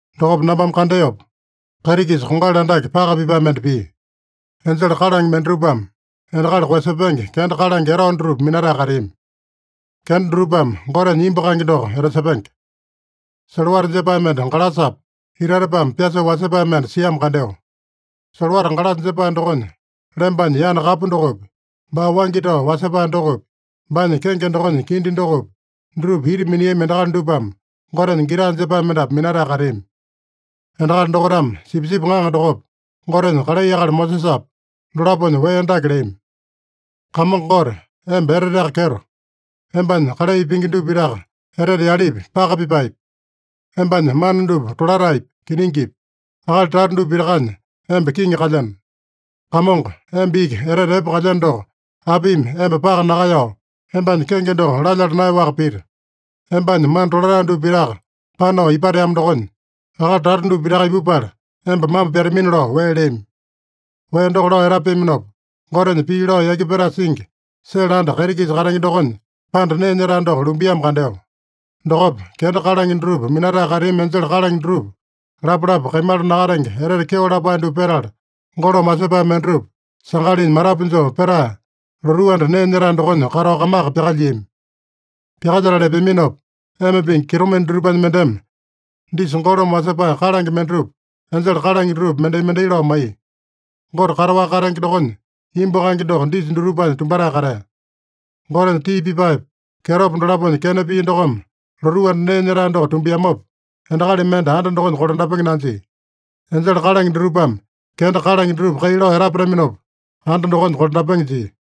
Dokopa nambame kandeopa, kaiti-kisa kongali andake, paka pipae mende pia. Enjele kalange mendatupame endakali koeyasepenge kenda kalange etao dutupa minatae kateami. Kenda dutupame Gotenya imbu kaenge doko etasepenge. Solowata jepae mende galasapa, itatepame pyasoo wasepae mende siamo kandeo. Solowata galasa jepae dokonya lembanya yana kapu dokopi, baa waingi tao wasepae dokopi, baanya kenge dokonya kindi dokopi, dutupa ita miniami endakali dupame Gotenya gita jepae mendapu minatae kateami. Endakali dokaitame Sipisipi Ŋaŋa dokopa, Gotenya kalai akali Mosesapa, dolaponya wee dake leami: “Kamongo Gote, emba eteteaka kyeto. Embanya kalai pingi dupa pitaka etete yalepi, paka pipaepi. Embanya mana dupa tolataepi, kiningipi. Akali tata dupa pitakanya emba kiŋi kalyeno. Kamongo, emba iki etete epe kalyeno doko, apimi emba paka nakaeyao, embanya kenge doko lalyala naeyaowaka pita? Embanya mana tolatae dupa pitaka panao ipateamo dokonya, akali tata dupa pitaka ipupala emba mambo pyatamina” lao wee leami. Wee doko lao etapeaminopa, Gotenya pii lao yaki petae singi, sele anda kaiti-kisa katenge dokonya panda nee nyetae doko lumbiamo kandeo. Dokopa, kenda kalange dutupa minatae kateami enjele kalange dutupa lapalapa kaimala nakatenge etete kyeo lapae dupa petala, golome wasepae mendatupa sangalinya matapu joo petae, lotuu anda nee nyetae dokonya katao kamaka pyakalyiami. Pyakalyetala epeaminopa, ema pingi kitomende dutupanya mendeme disa golome wasepae kalange mendatupa enjele kalange dutupa mendai-mendai lao maiya. Gote kataowaka katenge dokonya imbu kaenge doko disa dutupanya tumbatae katea. Gotenya tii pipaepa, kyetopa dolaponya kena pia dokome lotuu anda nee nyetae doko tumbiamopa, endakali mende anda dokonya kolandapenge nanjia. Enjele kalange dutupame kenda kalange dutupa kai lao etapataminopa, anda dokonya kolandapenge jia.